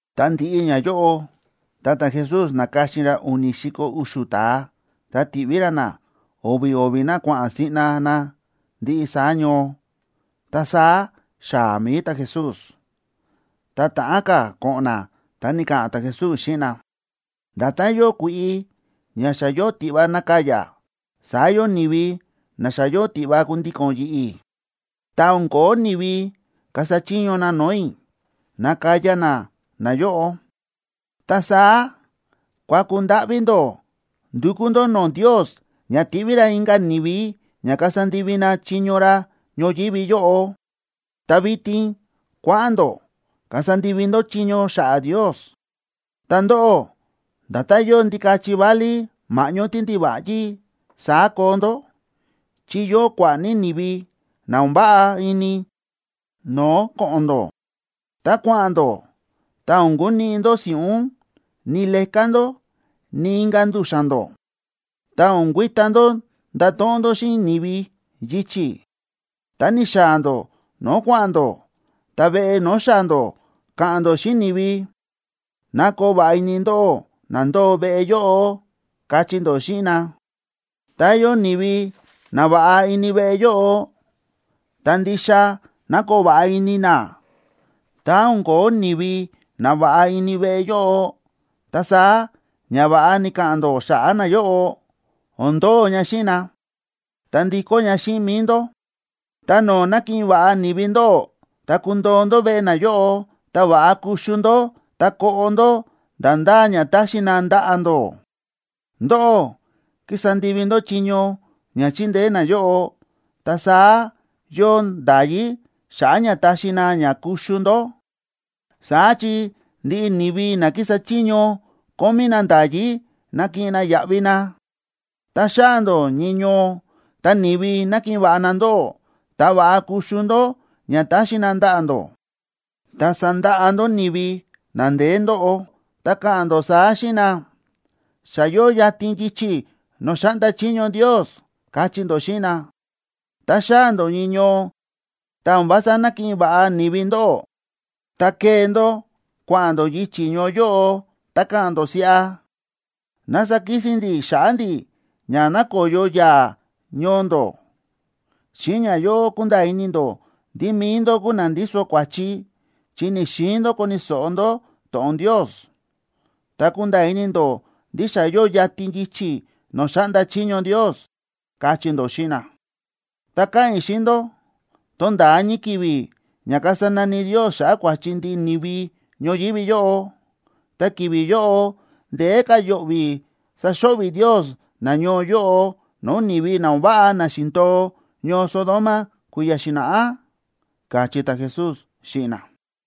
Ta ndi̱ꞌi ñayóꞌo, ta ta̱Jesús na̱ka̱xin ra u̱ni̱ si̱ko̱ u̱xu̱ ta̱a, ta ti̱ꞌví ra na, o̱vi̱ o̱vi̱ na kua̱ꞌa̱n siꞌna na ndiꞌi saá ñoo, ta saá xaa̱ mi̱i ta̱Jesús. Ta ta̱ꞌán ka̱ ko̱ꞌo̱n na ta ni̱ka̱ꞌa̱n ta̱Jesús xíꞌin na: ―Nda̱tán yóo kui̱ꞌi ña xa yóo tiꞌva nakaya, saá yóo ni̱vi na xa yóo tiꞌva kundíko̱n yi̱ꞌi̱, ta o̱n ko̱ó ni̱vi kasa chiño na no̱o̱ i̱ nakaya na nayóꞌo. Ta saá kuaku ndáꞌví ndó ndukú ndó no̱o̱ Ndios ña tiꞌví ra inka̱ ni̱vi ña kasa ndivi na chiño ra ñoyívi yóꞌo. Ta vitin kua̱ꞌa̱n ndó kasa ndivi ndó chiño xa̱ꞌa̱ Ndios. Ta ndóꞌó, nda̱tán yóo ndikachi válí ma̱ꞌñó tíndiva̱ꞌyí, saá koo ndó, chi yóo kua̱ꞌa̱ ní ni̱vi na o̱n váꞌa ini no̱o̱ ko̱ꞌo̱n ndó. Tá kua̱ꞌa̱n ndó, ta o̱n kuniꞌi ndó si̱ꞌún, ni leká ndó, ni inka̱ ndu̱xa̱n ndó. Ta o̱n kuita ndó ndato̱ꞌon ndó xíꞌin ni̱vi yichi̱. Tá ni̱xaa̱ ndó no̱o̱ kua̱ꞌa̱n ndó, ta veꞌe no̱o̱ xaa̱ ndó, ka̱ꞌa̱n ndó xíꞌin ni̱vi: “Ná koo va̱ꞌa ini ndóꞌó na ndóo veꞌe yóꞌo”, kachí ndó xíꞌin na. Tá yóo ni̱vi nava̱ꞌa ini veꞌe yóꞌo, ta ndixa ná koo va̱ꞌa ini na. Tá o̱n ko̱ó ni̱vi nava̱ꞌa ini veꞌe yóꞌo, ta saá ñava̱ꞌa ni̱ka̱ꞌa̱n ndó xa̱ꞌa̱ nayóꞌo, o̱n ndo̱o ña xíꞌin na, ta ndikó ña xíꞌin mi̱i ndó. Ta no̱o̱ na̱kiꞌin va̱ꞌa ni̱vi ndóꞌó, ta kundoo ndó veꞌe nayóꞌo. Ta va̱ꞌa kuxu ndó ta koꞌo ndó nda̱ ndá ña taxi na ndaꞌa̱ ndó. Ndóꞌó kísa ndivi ndó chiño ña chindeé nayóꞌo, ta saá yóo nda̱yí xa̱ꞌa̱ ña taxi na ña kuxu ndó. Saá chi ndiꞌi ni̱vi na kísa chiño kómí na nda̱yí nakiꞌin na yaꞌvi na. Tá xaa̱ ndó ñii ñoo, ta ni̱vi nakiꞌin va̱ꞌa na ndóꞌó, ta va̱ꞌa kuxu ndó ña taxi na ndaꞌa̱ ndó, ta sandaꞌa ndó ni̱vi na ndeé ndóꞌo, ta ka̱ꞌa̱n ndó saá xíꞌin na: “Xa yóo yatin yichi̱ no̱o̱ xáꞌnda chiño Ndios”, kachí ndó xíꞌin na. Tá xaa̱ ndó ñii ñoo, tá o̱n vása nákiꞌin va̱ꞌa ni̱vi ndóꞌó, ta kee ndó kua̱ꞌa̱n ndó yichi̱ ñoo yóꞌo, ta ka̱ꞌa̱n ndó siꞌa: “Ná sakisin ndi̱ xa̱ꞌa̱ ndi̱ ña nakoyo yaa̱ ñoo ndó. Xíꞌin ñayóꞌo kunda̱a̱ ini ndó ndí mi̱i ndó kúu na ndíso kua̱chi, chi ni̱‑xiin ndó koni̱ so̱ꞌo ndó to̱ꞌon Ndios. Ta kunda̱a̱ ini ndó ndí xa yóo yatin yichi̱ no̱o̱ xáꞌnda chiño Ndios”, kachí ndó xíꞌin na. Ta káꞌa̱n i̱ xíꞌin ndó, tonda̱a ñii ki̱vi̱ ña kasa nani Ndios xa̱ꞌa̱ kua̱chi ndiꞌi ni̱vi ñoyívi yóꞌo. Ta ki̱vi̱ yóꞌo ndeé ka̱ yo̱ꞌvi̱ saxo̱ꞌvi̱ Ndios nañoo yóꞌo no̱o̱ ni̱vi na o̱n váꞌa na xi̱ndo̱o ñoo Sodoma kui̱ya̱ xi̱na̱ꞌá ―káchí ta̱Jesús xíꞌin na.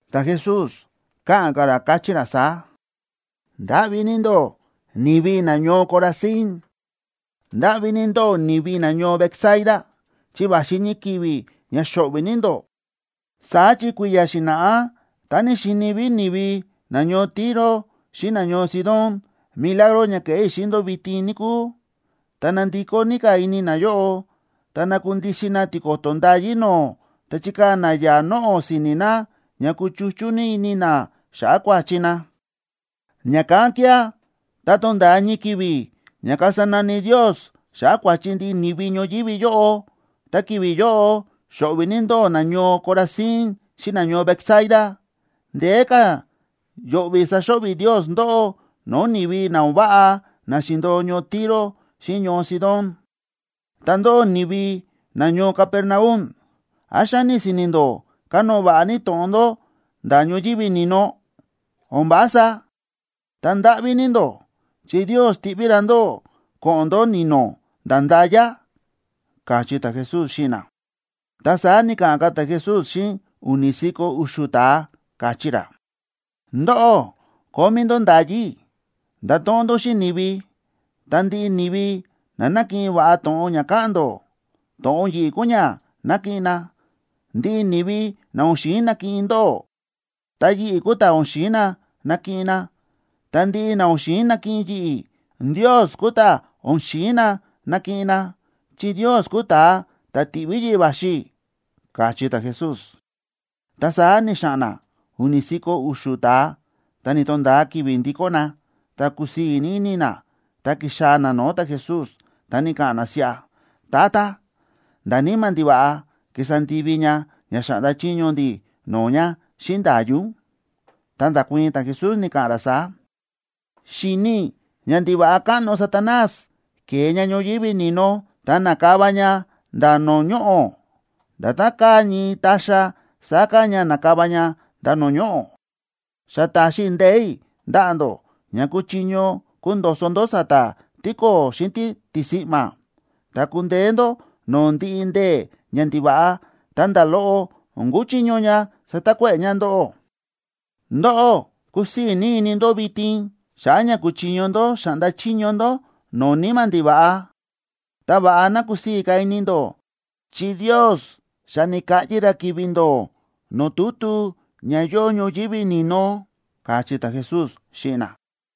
Ta̱Jesús káꞌa̱n ka̱ ra, káchí ra saá: ―¡Ndáꞌví ní ndó, ni̱vi nañoo Corazín! ¡Ndáꞌví ní ndó, ni̱vi nañoo Betsaida! Chi va̱xi ñii ki̱vi̱ ña xo̱ꞌvi̱ ní ndó. Saá chi kui̱ya̱ xi̱na̱ꞌá tá xíni ví ni̱vi nañoo Tiro xíꞌin nañoo Sidón milagro ña kéꞌé i̱ xíꞌin ndó vitin, níkúu, ta nandikó ní ka̱ ini nayóꞌo, ta nakundixin na tiko̱to̱ ndayí no̱o̱, ta chikaa̱ na yaa̱ noꞌo̱ si̱ni̱ na ña kúchuchú ní ini na xa̱ꞌa̱ kua̱chi na. Ña̱kán kía̱, tá tonda̱a ñii ki̱vi̱ ña kasa nani Ndios xa̱ꞌa̱ kua̱chi ndiꞌi ni̱vi ñoyívi yóꞌo, ¡ta ki̱vi̱ yóꞌo xo̱ꞌvi̱ ní ndóꞌó, nañoo Corazín xíꞌin nañoo Betsaida! Ndeé ka̱ yo̱ꞌvi̱ saxo̱ꞌvi̱ Ndios ndóꞌó no̱o̱ ni̱vi na o̱n váꞌa na xi̱ndo̱o ñoo Tiro xíꞌin ñoo Sidón. Ta ndóꞌó, ni̱vi nañoo Capernaum ¿án xáni si̱ni̱ ndó kanóo va̱ꞌa ní to̱ꞌon ndó nda̱ ñoyívi ni̱no? ¡O̱n vása! Ta ndáꞌví ní ndó, chi Ndios tiꞌví ra ndóꞌó ko̱ꞌo̱n ndó ni̱no̱, nda̱ nda̱ya ―káchí ta̱Jesús xíꞌin na. Ta saá ni̱ka̱ꞌa̱n ka̱ ta̱Jesús xíꞌin u̱ni̱ si̱ko̱ u̱xu̱ ta̱a, káchí ra: ―Ndóꞌó kómí ndó nda̱yí i̱ ndato̱ꞌon ndó xíꞌin ni̱vi. Ta ndiꞌi ni̱vi na nakiꞌin va̱ꞌa to̱ꞌon ña káꞌa̱n ndó, to̱ꞌon yi̱ꞌi̱ kúu ña nakiꞌin na. Ndiꞌi ni̱vi na o̱n xi̱in nakiꞌin ndóꞌó, ta yi̱ꞌi̱ kúu ta̱ o̱n xi̱in na nakiꞌin na. Ta ndiꞌi na o̱n xi̱in nakiꞌin yi̱ꞌi̱, Ndios kúu ta̱ o̱n xi̱in na nakiꞌin na, chi Ndios kúu ta̱a ta̱ ti̱ꞌví yi̱ꞌi̱ va̱xi i̱ ―káchí ta̱Jesús. Ta saá ni̱xa̱ꞌa̱n na u̱ni̱ si̱ko̱ u̱xu̱ ta̱a, ta ni̱to̱nda̱a ki̱vi̱ ndikó na, ta kúsii̱ ní ini na, ta ki̱xaa̱ na no̱o̱ ta̱Jesús, ta ni̱ka̱ꞌa̱n na siꞌa: ―Tata, nda̱ níma̱ ndiva̱ꞌa ki̱sa ndivi ña ña xa̱ꞌnda chiño ndi̱ no̱o̱ ña xíꞌin nda̱yí ún. Ta nda̱kuii̱n ta̱Jesús, ni̱ka̱ꞌa̱n ra saá: ―Xi̱ni i̱ ñandiva̱ꞌa káꞌno Satanás ke̱e ña ñoyívi ni̱no, ta na̱kava ña nda̱ no̱o̱ ñoꞌo̱. Nda̱tán káa ñii ta̱xa̱, saá káa ña na̱kava ña nda̱ no̱o̱ ñoꞌo̱. Xa ta̱xi i̱ ndee̱ i̱ ndaꞌa̱ ndó ña kuchiño kundo̱so̱ ndó sa̱ta̱ tíko̱o̱ xíꞌin títisi̱ꞌma̱, ta kundeé ndó no̱o̱ ndiꞌi ndee̱ ñandiva̱ꞌa, ta nda̱ loꞌo o̱n kuchiño ña satakuéꞌe̱ ña ndóꞌó. Ndóꞌó, kúsii̱ ní ini ndó vitin, xa̱ꞌa̱ ña kúchiño ndó xáꞌnda chiño ndó no̱o̱ níma̱ ndiva̱ꞌa. Ta va̱ꞌa ná kusii̱ ní ka̱ ini ndó chi Ndios xa ni̱kaꞌyi ra ki̱vi̱ ndó no̱o̱ tutu ña yóo ñoyívi ni̱no ―káchí ta̱Jesús xíꞌin na.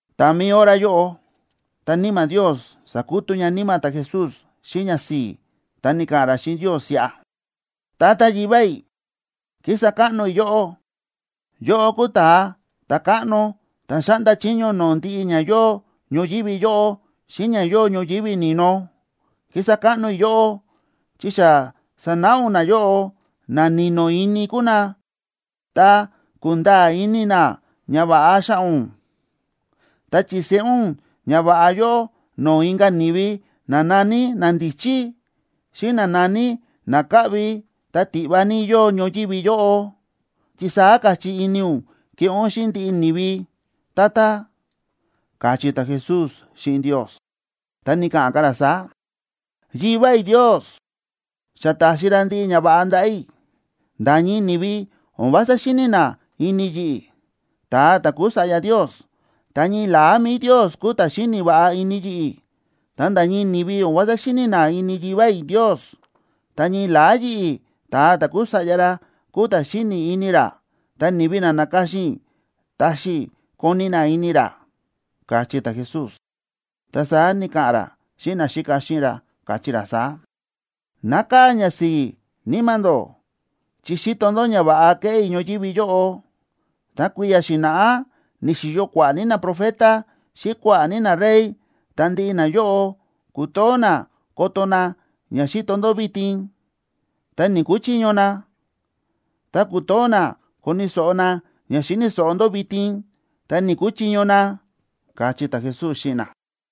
Ta mi̱i hora yóꞌo, ta Níma̱ Ndios sa̱kutú ña níma̱ ta̱Jesús xíꞌin ñasi̱i̱, ta ni̱ka̱ꞌa̱n ra xíꞌin Ndios siꞌa: ―Tata Yivá i̱, ¡kísa káꞌno i̱ yóꞌó! Yóꞌó kúu Ta̱a Ta̱káꞌno ta̱ xáꞌnda chiño no̱o̱ ndiꞌi ña yóo ñoyívi yóꞌo xíꞌin ña yóo ñoyívi ni̱no. Kísa káꞌno i̱ yóꞌó, chi xa sa̱náꞌa ún nayóꞌo, na ni̱no̱ ini kúu na, ta kúnda̱a̱ ini na ñava̱ꞌa xa̱ꞌa̱ ún. Ta chi̱seꞌé ún ñava̱ꞌa yóꞌo no̱o̱ inka̱ ni̱vi na na̱ní nandíchí, xíꞌin na na̱ní na káꞌvi ta tiꞌva ní yóo ñoyívi yóꞌo, chi saá káchí ini ún keꞌé ún xíꞌin ndiꞌi ni̱vi, Tata ―káchí ta̱Jesús xíꞌin Ndios. Ta ni̱ka̱ꞌa̱n ka̱ ra saá: ―Yivá i̱ Ndios xa ta̱xi ra ndiꞌi ñava̱ꞌa ndaꞌa̱ i̱. Nda̱ ñii ni̱vi o̱n vása xíni̱ na ini yi̱ꞌi̱, ta̱a ta̱ kúu Sa̱ꞌya Ndios, ta ñii la̱á mi̱i Ndios kúu ta̱ xíni̱ va̱ꞌa ini yi̱ꞌi̱. Ta nda̱ ñii ni̱vi o̱n vása xíni̱ na ini Yivá i̱ Ndios, ta ñii la̱á yi̱ꞌi̱, ta̱a ta̱ kúu Sa̱ꞌya ra, kúu ta̱ xíni̱ ini ra, ta ni̱vi na na̱ka̱xin i̱ taxi i̱ koni̱ na ini ra ―káchí ta̱Jesús. Ta saá ni̱ka̱ꞌa̱n ra xíꞌin naxíka xíꞌin ra, káchí ra saá: ―Nákaa̱ ñasi̱i̱ níma̱ ndó chi xíto ndó ñava̱ꞌa kéꞌé i̱ ñoyívi yóꞌo. Ta kui̱ya̱ xi̱na̱ꞌá ni̱xi̱yo kua̱ꞌa̱ ní naprofeta xíꞌin kua̱ꞌa̱ ní narey, ta ndiꞌi nayóꞌo ku̱too na koto na ña xíto ndó vitin, ta ni̱‑kuchiño na. Ta ku̱too na koni̱ so̱ꞌo na ña xíni̱ so̱ꞌo ndó vitin, ta ni̱‑kuchiño na ―káchí ta̱Jesús xíꞌin na.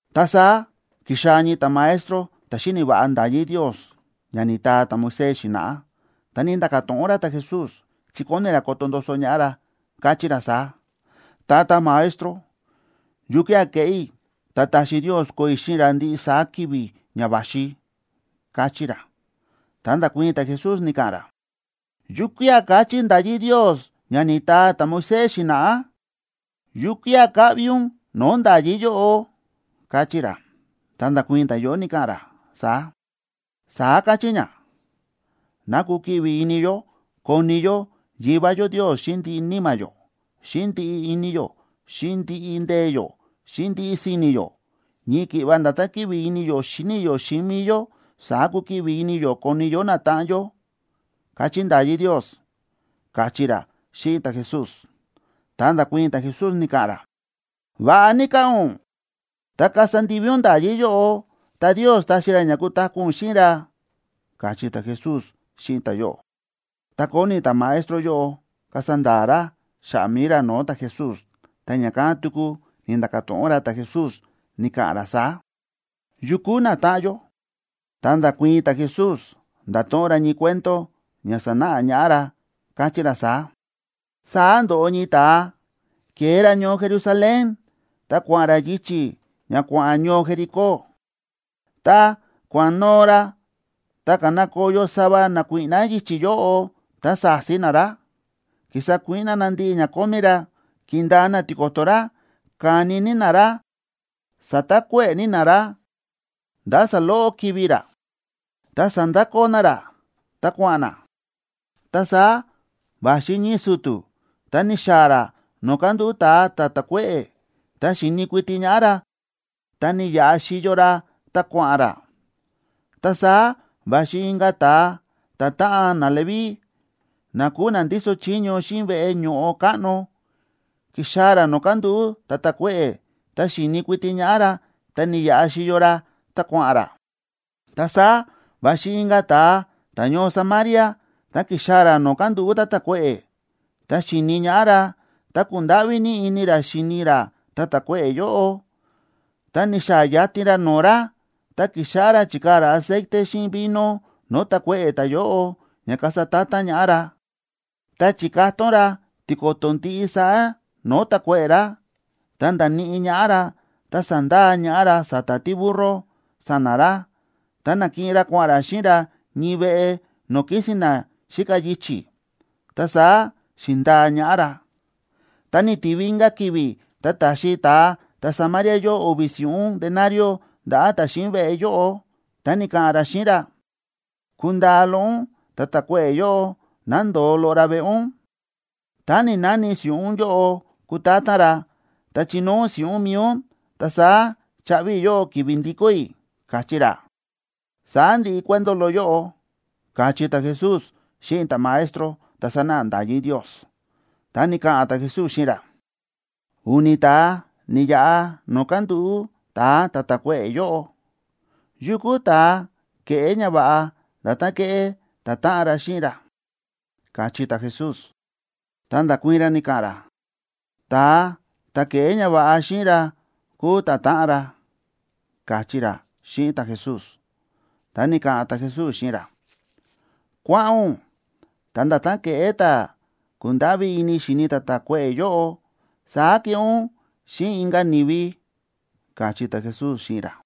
Ta saá ki̱xaa̱ ñii ta̱maestro ta̱ xíni̱ va̱ꞌa nda̱yí Ndios ña ni̱taa ta̱Moisés xi̱na̱ꞌá, ta ni̱nda̱ka̱ to̱ꞌon ra ta̱Jesús, chi kóni ra koto ndoso ñaꞌá ra, káchí ra saá: ―Tata Maestro, ¿yukía̱ keꞌé i̱, ta taxi Ndios koo i̱ xíꞌin ra ndiꞌi saá ki̱vi̱ ña va̱xi? ―káchí ra. Ta nda̱kuii̱n ta̱Jesús, ni̱ka̱ꞌa̱n ra: ―¿Yukía̱ káchí nda̱yí Ndios ña ni̱taa ta̱Moisés xi̱na̱ꞌá? ¿Yukía̱ káꞌvi ún no̱o̱ nda̱yí yóꞌo? ―káchí ra. Ta nda̱kuii̱n ta̱yóꞌo, ni̱ka̱ꞌa̱n ra saá: ―Saá káchí ña: “Ná kukiꞌvi ini yó koni yó Yivá yó Ndios xíꞌin ndiꞌi níma̱ yó, xíꞌin ndiꞌi ini yó, xíꞌin ndiꞌi ndee̱ yó, xíꞌin ndiꞌi si̱ni̱ yó. Ñii ki̱ꞌva nda̱tán kíꞌvi ini yó xíni yó xíꞌin mi̱i yó, saá kukiꞌvi ini yó koni yó natáꞌan yó”, káchí nda̱yí Ndios ―káchí ra xíꞌin ta̱Jesús. Ta nda̱kuii̱n ta̱Jesús, ni̱ka̱ꞌa̱n ra: ―Va̱ꞌa ní káꞌa̱n ún. Tá kasa ndivi ún nda̱yí yóꞌo, ta Ndios taxi ra ña kutaku̱ ún xíꞌin ra ―káchí ta̱Jesús xíꞌin ta̱yóꞌo. Ta kóni ta̱maestro yóꞌo kasa nda̱a̱ ra xa̱ꞌa̱ mi̱i ra no̱o̱ ta̱Jesús, ta ña̱kán tuku ni̱nda̱ka̱ to̱ꞌon ra ta̱Jesús, ni̱ka̱ꞌa̱n ra saá: ―¿Yu kúu natáꞌan yó? Ta nda̱kuii̱n ta̱Jesús, nda̱to̱ꞌon ra ñii cuento ña sanáꞌa ñaꞌá ra, káchí ra saá: ―Saá ndo̱ꞌo ñii ta̱a ke̱e ra ñoo Jerusalén, ta kua̱ꞌa̱n ra yichi̱ ña kua̱ꞌa̱n ñoo Jericó. Tá kua̱ꞌa̱n noo ra, ta ka̱na ko̱yo sava nakuíꞌná yichi̱ yóꞌo, ta sa̱si na ra, ki̱sa kuíꞌná na ndiꞌi ña kómí ra, ki̱ndaa na tiko̱to̱ ra, ka̱ni ní na ra, sa̱takuéꞌe̱ ní na ra nda̱ saloꞌo kivi̱ ra. Ta sa̱ndakoo na ra, ta kua̱ꞌa̱n na. Ta saá va̱xi ñii su̱tu̱, ta ni̱xaa̱ ra no̱o̱ kándúꞌu̱ ta̱a ta̱ ta̱kuéꞌe̱, ta xi̱ni̱ kuiti ñaꞌá ra, ta ni̱yaꞌa xíyo ra, ta kua̱ꞌa̱n ra. Ta saá va̱xi inka̱ ta̱a, ta̱táꞌan naLeví, na kúu na ndíso chiño xíꞌin veꞌe ño̱ꞌo káꞌno. Ki̱xaa̱ ra no̱o̱ kándúꞌu̱ ta̱ ta̱kuéꞌe̱, ta xi̱ni̱ kuiti ñaꞌá ra, ta ni̱yaꞌa xíyo ra, ta kua̱ꞌa̱n ra. Ta saá va̱xi inka̱ ta̱a ta̱ñoo Samaria, ta ki̱xaa̱ ra no̱o̱ kándúꞌu̱ ta̱ ta̱kuéꞌe̱. Tá xi̱ni ñaꞌá ra, ta ku̱ndáꞌví ní ini ra xi̱ni ra ta̱ ta̱kuéꞌe̱ yóꞌo. Ta ni̱xaa̱ yatin ra no̱o̱ ra, ta ki̱xáꞌá ra chíkaa̱ ra aceite xíꞌin vino no̱o̱ ta̱kuéꞌe̱ ta̱yóꞌo ña kasa ta̱ta̱n ñaꞌá ra. Ta chi̱katón ra tiko̱to̱ ndiꞌi saá no̱o̱ ta̱kuéꞌe̱ ra. Ta nda̱níꞌi ñaꞌá ra, ta sa̱ndaa ñaꞌá ra sa̱ta̱ tíburro sa̱na̱ ra, ta na̱kiꞌin ra kua̱ꞌa̱n ra xíꞌin ra ñii veꞌe no̱o̱ kísi̱n na xíka yichi̱, ta saá xi̱ndaa ñaꞌá ra. Tá ni̱tivi inka̱ ki̱vi̱, ta ta̱xi ta̱a ta̱Samaria yóꞌo o̱vi̱ si̱ꞌún denarioa ndaꞌa̱ ta̱ xíꞌin veꞌe yóꞌo, ta ni̱ka̱ꞌa̱n ra xíꞌin ra: “Kundaa loꞌo ún ta̱ ta̱kuéꞌe̱ yóꞌo ná ndo̱o loꞌo ra veꞌe ún. Tá ni̱‑nani si̱ꞌún yóꞌo kutátán ra, ta chinóo ún si̱ꞌún mi̱i ún, ta saá chaꞌvi i̱ yóꞌó ki̱vi̱ ndikó i̱”, káchí ra. Saá ndi̱ꞌi cuento loꞌo yóꞌo ―káchí ta̱Jesús xíꞌin ta̱maestro ta̱ sánáꞌa nda̱yí Ndios. Ta ni̱ka̱ꞌa̱n ta̱Jesús xíꞌin ra: ―U̱ni̱ ta̱a ni̱yaꞌa no̱o̱ kándúꞌu̱ ta̱a ta̱ ta̱kuéꞌe̱ yóꞌo. ¿Yukú ta̱a ke̱ꞌé ñava̱ꞌa nda̱tán kéꞌé ta̱táꞌan ra xíꞌin ra? ―káchí ta̱Jesús. Ta nda̱kuii̱n ra, ni̱ka̱ꞌa̱n ra: ―Ta̱a ta̱ ke̱ꞌé ñava̱ꞌa xíꞌin ra kúu ta̱táꞌan ra ―káchí ra xíꞌin ta̱Jesús. Ta ni̱ka̱ꞌa̱n ta̱Jesús xíꞌin ra: ―Kua̱ꞌa̱n ún, ta nda̱tán ke̱ꞌé ta̱ ku̱ndáꞌví ini xi̱ni ta̱ ta̱kuéꞌe̱ yóꞌo, saá keꞌé ún xíꞌin inka̱ ni̱vi ―káchí ta̱Jesús xíꞌin ra.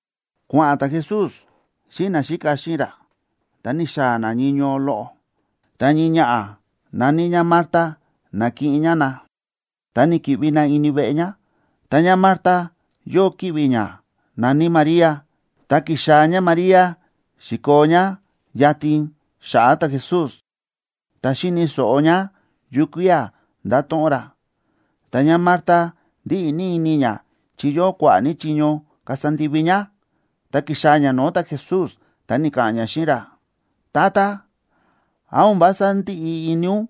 Kua̱ꞌa̱n ta̱Jesús xíꞌin naxíka xíꞌin ra, ta ni̱xaa̱ na ñii ñoo loꞌo. Ta ñii ñaꞌa̱ na̱ní ñá Marta na̱kiꞌin ñá na, ta ni̱ki̱ꞌvi na ini veꞌe ñá. Ta ñáMarta yóo ki̱ꞌvi̱ ñá na̱ní María, ta ki̱xaa̱ ñáMaría xi̱koo ñá yatin xa̱ꞌa̱ ta̱Jesús, ta xíni̱ so̱ꞌo ñá yukía̱ ndáto̱ꞌon ra. Ta ñáMarta ndíꞌi ní ini ñá chi yóo kua̱ꞌa̱ ní chiño kasa ndivi ñá. Ta ki̱xaa̱ ñá no̱o̱ ta̱Jesús, ta ni̱ka̱ꞌa̱n ñá xíꞌin ra: ―Tata, ¿án o̱n vása ndíꞌi ini ún,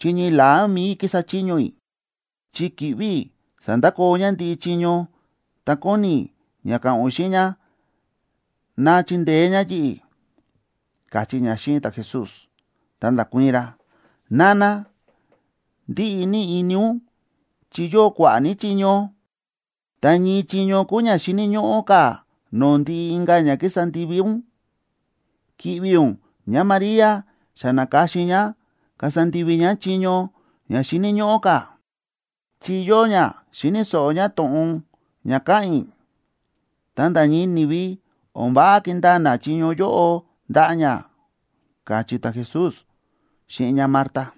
chi ñii la̱á mi̱i i̱ kísa chiño i̱? Chi ki̱ꞌvi̱ i̱ sa̱ndakoo ñá ndiꞌi chiño, ta kóni i̱ ña ka̱ꞌa̱n ún xíꞌin ñá ná chindeé ñá yi̱ꞌi̱ ―káchí ñá xíꞌin ta̱Jesús. Ta nda̱kuii̱n ra: ―Nana, ndíꞌi ní ini ún chi yóo kua̱ꞌa̱ ní chiño. Ta ñii chiño kúu ña xíni̱ ñóꞌó ka̱ no̱o̱ ndiꞌi inka̱ ña kísa ndivi ún. Ki̱ꞌvi̱ ún ñáMaría xa na̱ka̱xin ñá kasa ndivi ñá chiño ña xíni̱ ñóꞌó ka̱, chi yóo ñá, xíni̱ so̱ꞌo ñá to̱ꞌon ña káꞌa̱n i̱. Ta nda̱ ñii ni̱vi, o̱n váꞌa kindaa na chiño yóꞌo ndaꞌa̱ ñá ―káchí ta̱Jesús xíꞌin ñáMarta.